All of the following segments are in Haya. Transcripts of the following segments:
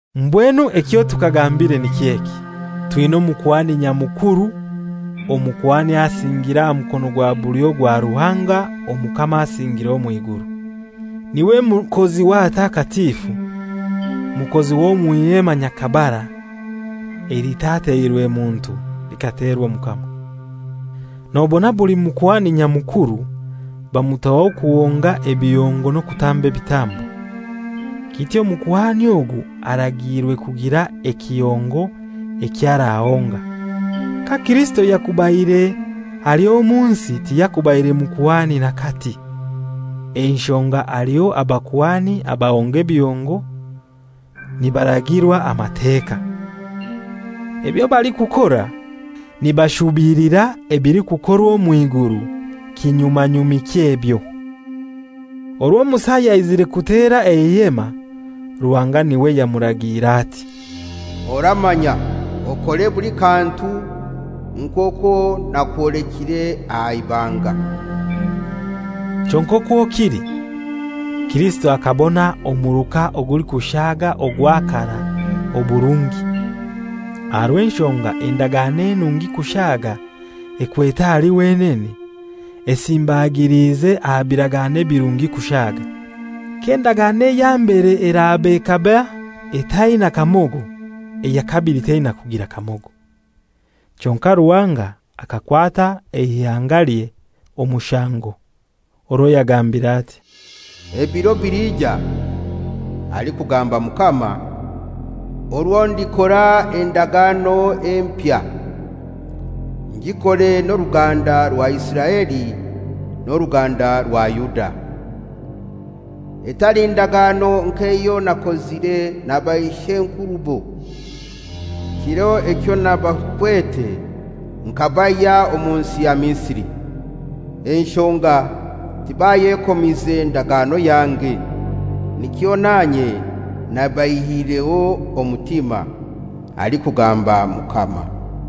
Mbwenu ekyo tukagambire niky'eki: Twina Omukuhani Nyamukuru, Omukuhani asingiire aha mukono gwa bulyo gwa Ruhanga Omukama asingiire omw'iguru. N'iwe mukozi w'ahatakatifu, mukozi w'omw'ihema nyakabara, elitateirwe muntu, likaterwa Omukama. Nobona buli Mukuhani Nyamukuru bamutaho kuhonga ebihongo n'okutamba ebitambo; kityo omukuhani ogu aragiirwe kugira ekihongo ekyo arahonga. Ka Kirisito yakubaire hali omu nsi tiyakubaire mukuhani n'akati, enshonga aliho abakuhani abahonga ebihongo nibaragirwa Amateka. Ebyo balikukora nibashubilira ebilikukorwa omw'iguru; kinyumanyumi ky'ebyo. Orwo Musa yaizire kutera eihema, Ruhanga n'iwe yamuragiire ati, «Oramanya okore buli kantu nk'okwo nakwolekire aha ibanga.» Kyonkai okwo kili, Kirisito akabona omuruka ogulikushaaga ogwa karai oburungi, aha rw'enshonga endagano enungi kushaaga ekwete ahali wenene, esimbagilize aha biragano ebirungi kushaaga. K'endagano eya mbere eraba ekaba etaina kamogo, eya kabili teina kugira kamogo. Kyonkai Ruhanga akakwata eihangalye omushango, orwo yagambire ati, «Ebiro bilija, alikugamba Mukama, orwo ndikora endagano empya, ngikore n'oruganda rwa Isiraeli n'oruganda rwa Yuda; etali ndagano nk'eyo nakozire na baish'enkurubo, kiro ekyo nabakwete nkabaihya omu nsi ya Misiri. Enshonga tibayekomize ndagano yange, nikyo nanye nabaihireho omutima, alikugamba Mukama.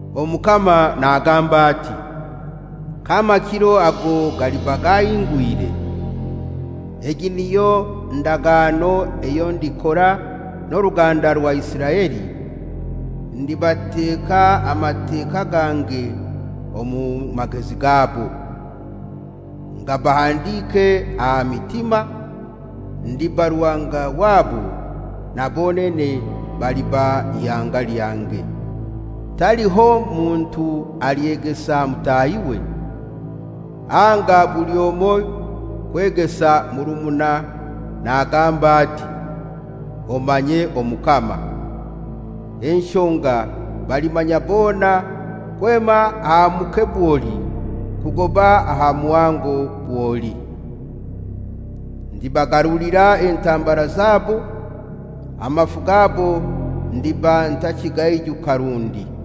Omukama nagamba ati, K'amakiro ago galiba gahingwire, egi niyo ndagano eyo ndikora n'oruganda rwa Isiraeli; ndibateka amateka gange omu magezi gabo, ngabahandike aha mitima, ndiba Ruhanga wabo, na bonene baliba ihanga lyange. Taliho muntu alyegesa mutahiwe, anga buli omoi kwegesa murumuna nagamba ati, ‹Omanye Omukama,› enshonga balimanya bona kwema aha muke bwoli kugoba aha muhango bwoli. Ndibagarulira entambara zabo, amafu gabo ndiba ntakigaijuka rundi.»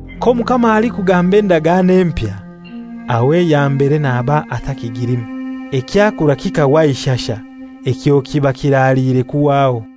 K'Omukama alikugamba endagano empya, aho eya mbere naba atakigilimu. Ekyakura kikahwa aha ishasha ekyo kiba kiraliire kuhwaho.